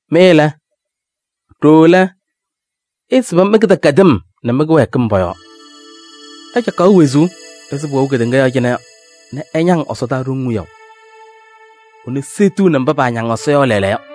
Mɩ lɛ, ɖooo lɛ, ɩɩsɩbɩ mɩ-kɩdɛkɛdɩm nɛ mɩ-kɩwɛɛkɩm pɔ-yɔɔ. Ɩcaɣkaɣ wezuu ɛzɩ pʋwɛʋ kedeŋa yɔɔ cɩnɛ yɔ nɛ ɩñaŋ ɛsɔdaa ɖoŋ wiyaʋ. Ɛnʋ seɣtiɣni mba paañaŋ Ɛsɔ yɔ lɛɛlɛɛyɔ.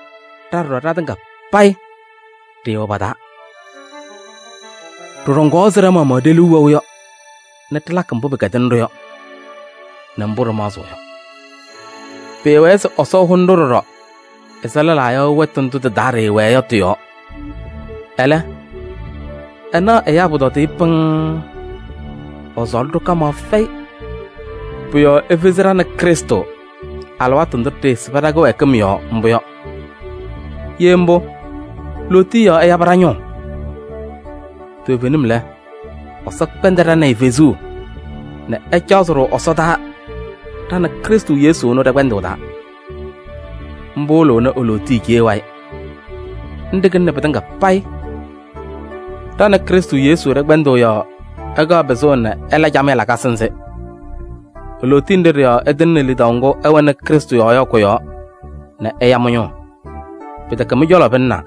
Ɖa ɖɔɖɔ ɖatɩŋa payɩ ɖɩɩwɛ pa-taa. Ɖɩɖɔŋaɣ ɛzɩ ɖa-maɣmaɣ ɖe-liu wɛʋ yɔ nɛ ɖɩlakɩ mbʋ pɩkɛdɩnɩ-ɖʋ yɔ nɛ mbʋ ɖɩmaɣzɩɣ yɔ. Pɩɩwɛɛ se Ɛsɔ ɛhʋnɩ-ɖʋ ɖɔɖɔ ɛzɩ lɛlaa yɔ wɛtʋ ndʋ tɩ-taa ɖɩwɛɛ yɔ tɩ-yɔɔ. Ɛlɛ, ɛnaɣ ɛyaa pʋtɔdɩyɛ pɩŋŋ, ɛsɔɔlɩ-ɖʋ kamaɣ fɛyɩ. Pʋ-yɔɔ efezi ɖa nɛ Krɩstʋ alɩwaatʋ ndʋ ɖɩɩsɩbɩ ɖa-kɩwɛɛkɩm yɔɔ mbʋ yɔ. Ye mbʋ, lootiye yɔɔ ɛyabɩ mɩ-ñʋʋ. Toovenim lɛ Ɛsɔ kpɛndɩ ɖa nɛ ɩ fezuu nɛ ɛcaɣzɩ-ɖʋ ɛsɔdaa ɖa nɛ Krɩstʋ Yesu ɛnʋ ɖɛ-kpɛndʋʋ taa. Mbʋ wɩlɩɣnɩ e-lootiye cee wayɩ. Nɖɩ kɩlɩnɩ pɩtɩŋa payɩ. Ɖa nɛ Krɩstʋ Yesu ɖɛ-kpɛndʋʋ yɔɔ ɛkaɣ pɩzʋʋ nɛ ɛla camɩyɛ lakasɩ nzɩ. E-lootiye nɖɩ ɖɩ-yɔɔ ɛtɩŋnɩ lidaʋ ŋgʋ ɩwɛnɩ Krɩstʋ yɔɔ yɔ kʋ-yɔɔ nɛ ɛya mɩ-ñʋʋ. Pɩtɛkɛ mɩ-cɔlɔ pɩlɩnaa,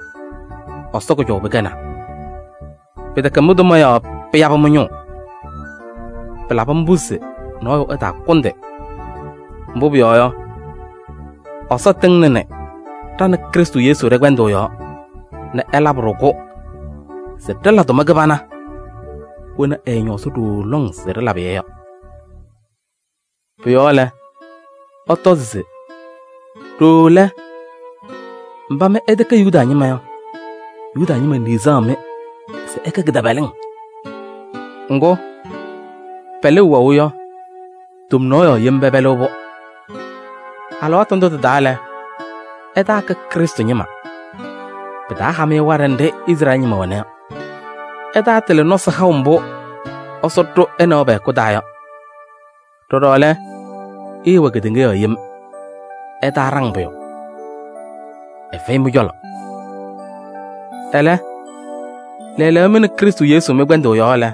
Ɛsɔ kʋjɔʋ pɩkɛnaa. Pɩtɛkɛ mɩ-tʋma yɔɔ pɩyabɩ mɩ-ñʋʋ. Pɩlabɩ mbʋ se nɔɔyʋ ɛtaakʋndɩ. Mbʋ pʋyɔɔ yɔ, Ɛsɔ tɩŋnɩnɩ ɖa nɛ Krɩstʋ Yesu ɖɛ-kpɛndʋʋ yɔɔ nɛ ɛlabɩ-ɖʋ-kʋ se ɖɩla tʋma kɩbana wena ɛɛñɔɔzɩ ɖooo lɔŋ se ɖɩlabɩ-yɛ yɔ. Pʋ-yɔɔ lɛ, ɩtɔzɩ se: ɖooo lɛ, mba mɩ ɩtɛkɛ Yuda ñɩma yɔ, Yuda ñɩma niɣzaɣ-mɩ se ɩkɛ kɩtɛpɛlɩŋ. Ŋgʋ, pɛlʋʋ wɛʋ yɔ, tomnaɣ yɔɔ yem pɛpɛlɩɣ-pʋ. Alɩwaatʋ ndʋ tɩ-taa lɛ, ɩtaakɛ Krɩstʋ ñɩma. Pɩtaaha-mɩ waɖɛ nɖɩ Izrɛɛlɩ ñɩma wɛna yɔ. Ɩtaatɩlɩ nɔsɩ haʋ mbʋ Ɛsɔ ɖʋ ɛ nɛ wɛ pɛ-hɛkʋ taa yɔ. Ɖɔɖɔ lɛ, ɩɩwɛ kedeŋa yɔɔ yem: ɩtaaɖaŋ pʋyʋ, ɛfɛyɩ mɩ-cɔlɔ. Ɛlɛ, lɛɛlɛɛyɔ mɩ nɛ Krɩstʋ Yesu mɩ-kpɛndʋʋ yɔɔ lɛ,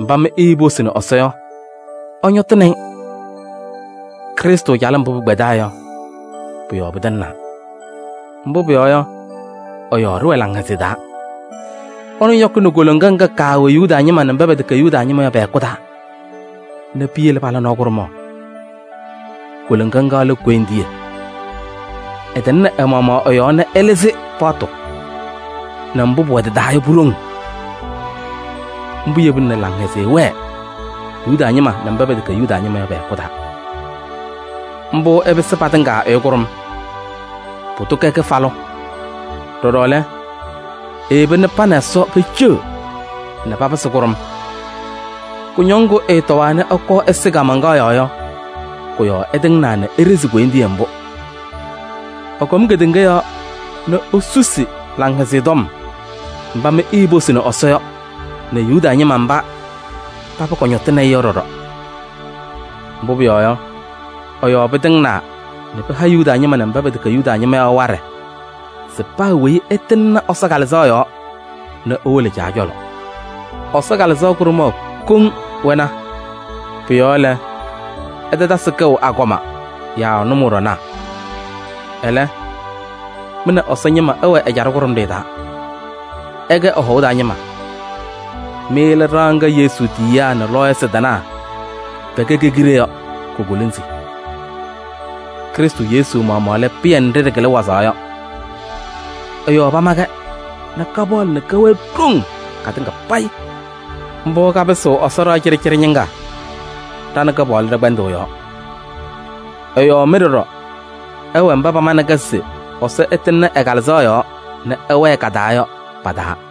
mba mɩ iiposini Ɛsɔ yɔ, ɩñɔtɩnɩ-ɩ. Krɩstʋ calɩm mbʋ pɩkpɛdaa yɔ, pʋ-yɔɔ pɩtɩŋnaa. Mbʋ pʋyɔɔ yɔ, ɛ-yɔɔ ɖɩwɛ laŋhɛzɩyɛ taa. Ɛnʋ yɔkɩnɩ koloŋa ŋga kaawɛ Yuda ñɩma nɛ mba pɛtɛkɛ Yuda ñɩma yɔ pɛ-hɛkʋ taa nɛ piyele pala nɔɔ kʋɖʋmaɣ. Koloŋa ŋga lɛ koyindiye. Ɛtɩŋnɩ ɛ-maɣmaɣ ɛ-yɔɔ nɛ ɛlɩzɩ paɣtʋ nɛ mbʋ pʋwɛ tɩ-taa yɔ pu-ɖoŋ. Mbʋ yebina nɛ laŋhɛzɩyɛ wɛɛ Yuda ñɩma nɛ mba pɛtɛkɛ Yuda ñɩma yɔ pɛ-hɛkʋ taa. Mbʋ ɛpɩsɩ patɩŋa ɛyʋ kʋɖʋm, pʋdʋ kɛ kɩfalʋ. Ɖɔɖɔ lɛ, eyeba nɛ pa nɛ Ɛsɔ peceɣ nɛ papɩsɩ kʋɖʋm. Kʋñɔŋ ŋgʋ ɛtɔwaa nɛ ɛkɔɔ ɛsɩ kaamaŋkaɣ yɔɔ yɔ, kʋ-yɔɔ ɛtɩŋnaa nɛ eɖezi koyindiye mbʋ. Ɛkɔm kedeŋa yɔɔ nɛ esusi Laŋhɛzɩyɛ Tɔm mba mɩ iiposini Ɛsɔ yɔ nɛ Yuda ñɩma mba paba kɔñɔtɩnɩ-ɩ yɔ ɖɔɖɔ. Mbʋ pʋyɔɔ yɔ, ɛ-yɔɔ pɩtɩŋnaa nɛ pɩha Yuda ñɩma nɛ mba pɛtɛkɛ Yuda ñɩma yɔ waɖɛ se paa weyi ɛtɩŋnɩ Ɛsɔ Kalɩzaɣ yɔɔ nɛ ewolo Caa cɔlɔ. Ɛsɔ Kalɩzaɣ kʋɖʋmaɣ kɔŋ wɛna. Pʋ-yɔɔ lɛ, ɩtatasɩ kɛʋ agɔma yaa nʋmɔɖɔnaa. Ɛlɛ, mɩ nɛ Ɛsɔ ñɩma ɩwɛ ɛjaɖɛ kʋɖʋmɖɩyɛ taa, ɩkɛ ɛ-hɔʋ taa ñɩma. Mɩ lɛ ɖɩɣa ŋga Yesu tiyiyaa nɛ lɔɔyɩsɩ tɩnaa pɛkɛ ke-kiɖe yɔ ko-kolonzi. Krɩstʋ Yesu maɣmaɣ lɛ pɩyɛ nɖɩ ɖɩkɩlɩ wazaɣ yɔ. Ɛ-yɔɔ pama-kɛ nɛ kapaɣlɩ nɛ kɛwɛɛ ɖoŋ katɩŋa payɩ. Mbʋ kapɩsɩɣ Ɛsɔ ɖɩɣa cɩɖɩcɩɖɩ ñɩŋga ɖa nɛ Kɩpaɣlʋ ɖɛ-kpɛndʋʋ yɔɔ. Ɛ-yɔɔ mɩ ɖɔɖɔ ɩwɛ mba pamanɩ-kɛ se Ɛsɔ ɛtɩŋnɩ ɛ-Kalɩzaɣ yɔɔ nɛ ɛwɛɛ ka-taa yɔ pa-taa.